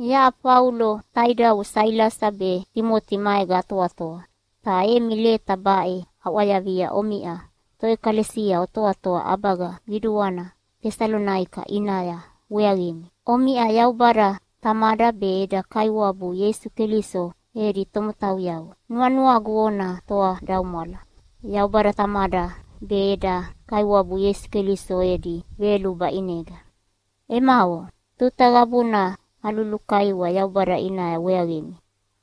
Yaʼa Faulo taidavo Sailasa be Timoti maega atoatoa, ta emi leta baʼe aʼwayavia omiʼa toʼekalesia otoatoa ʼabaga qiduana Tesalonaika ʼinaya weaqimi. Omiʼa Yaubada Tamada be eda Kaiwabu Ieisu Keliso edi tomotauyavo. Nuanuagu ona toadaumwala Yaubada Tamada be eda Kaiwabu Ieisu Keliso edi veyoluba ʼinega. Emavo, tuta qabuna alulukaiwa Yaubada ʼinaya weaqimi.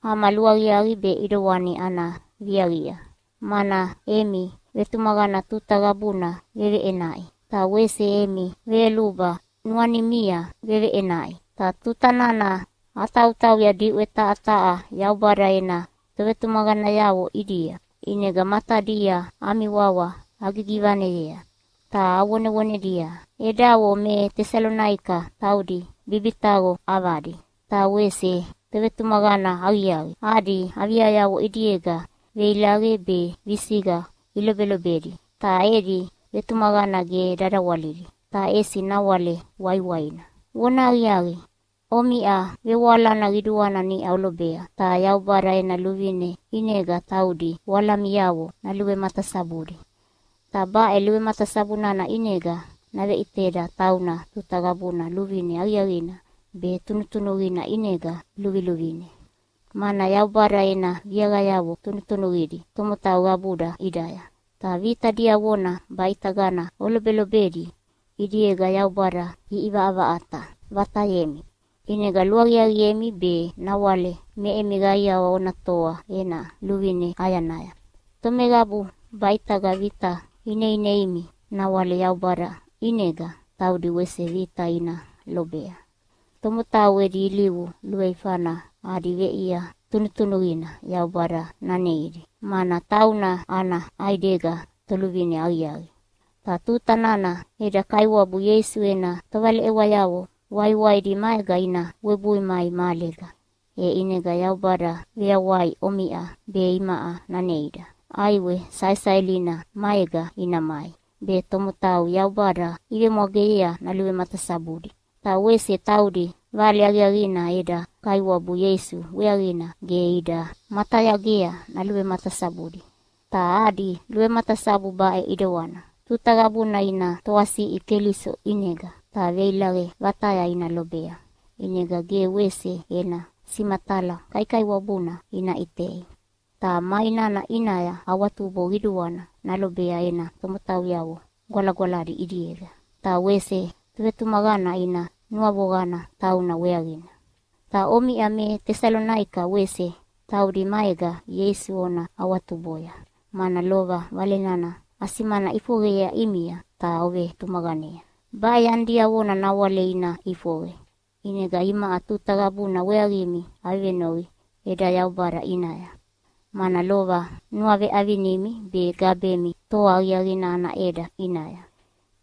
Ama luaqiaqi be ʼidewani ana viaqia, mana emi vetumaqana tuta qabuna veveʼenaʼi, ta wese emi veyoluba nuanimia veveʼenaʼi. Ta tuta nana atautauya diʼwe taha taha Yaubada ena tovetumaqanayavo ʼidia, ʼinega matadia ami wawa agigivaneyea ta avonevonedia, “Edavo me Tesalonaika taudi bibitaqo ʼavadi ta wese tovetumaqana aqiaqi. Adi aviayavo ʼidiega veilaqe be visiqa ilobelobedi, ta edi vetumaqana ge dadawalili, ta ʼesi nawale waiwaina.” Vonahaqiaqi, omiʼa vevoalana qiduana niʼa olobea, ta Yaubada ena luvine ʼinega taudi voalamiavo naluvematasabudi. Ta baʼe luvematasabu nana ʼinega naveʼiteda tauna tuta qabuna luvine aqiaqina be tunutunuqina ʼinega luviluvine. Mana Yaubada ena viaqayavo tunutunuqidi tomotau qabuda ʼidaya. Ta vita diavona baʼitagana olobelobedi ʼidiega Yaubada ʼivaʼavaʼata vatayemi, ʼinega luaqiaqiemi be nawale me emi qaiawa ona toa ena luvine ʼayanaya. Tomeqabu baʼitaga vita ineineimi nawale Yaubada ʼinega taudi wese vita ina lobea. Tomotau edi ilivu luveifana adi veʼia tunutunuqina Yaubada naneidi, mana tauna ana ʼaidega Toluvine Aqiaqi. Ta tuta nana eda Kaiwabu Ieisu ena tovaleʼewayavo waiwaidi maega ina webui mai mahalega, e ʼinega Yaubada veyawai omiʼa be imaʼa naneida. ʼAiwe saesaelina maega ina mai, be tomotau Yaubada ivemwageyea naluvematasabudi. Ta wese taudi Vale Aqiaqina eda Kaiwabu Ieisu weaqina ge ida matayagea naluvematasabudi. Ta adi luvematasabu baʼe ʼidewana: Tuta qabuna ina toasiʼi Keliso ʼinega ta veilaqe vataya ina lobea, ʼinega ge wese ena simatala kaikaiwabuna ina ʼitei. Ta mai nana ʼinaya awatubo qiduana nalobea ena tomotauyavo gwalagwaladi ʼidiega, ta wese tovetumaqana ina nuavoqana tauna weaqina. Ta omiʼa me Tesalonaika wese taudi maega Ieisu ona awatuboya, mana lova Vale nana asimana ʼifoqeyea ʼimia ta ovetumaqanea. Baʼe yani diavona nawale ina ʼifoqe, ʼinega imaʼa tuta qabuna weaqimi avevenoqi eda Yaubada ʼinaya. Mana lova nuaveʼavinimi be gabemi toa aqiaqina ana ʼeda ʼinaya.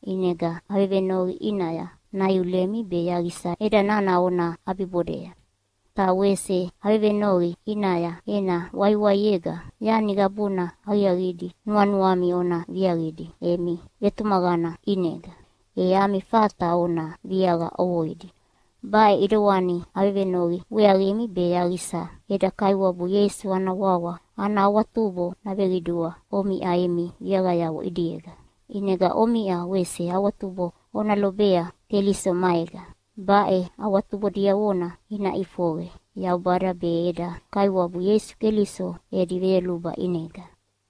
ʼInega avevenoqi ʼinaya naiulemi be yaqisa ʼeda nana ona ʼabibodea. Ta wese avevenoqi ʼinaya ena waiwaiega yani qabuna aqiaqidi nuanuami ona viaqidi emi vetumaqana ʼinega, e ami fata ona viaqa ʼovoidi. Baʼe ʼidewani avevenoqi weaqimi be yaqisa eda Kaiwabu Ieisu ana wawa ana awatubo naveqidua omiʼa emi viaqayavo ʼidiega, ʼinega omiʼa wese awatubo ona lobea Keliso maega. Baʼe awatubo diavona ina ʼifoqe Yaubada be eda Kaiwabu Ieisu Keliso edi veyoluba ʼinega.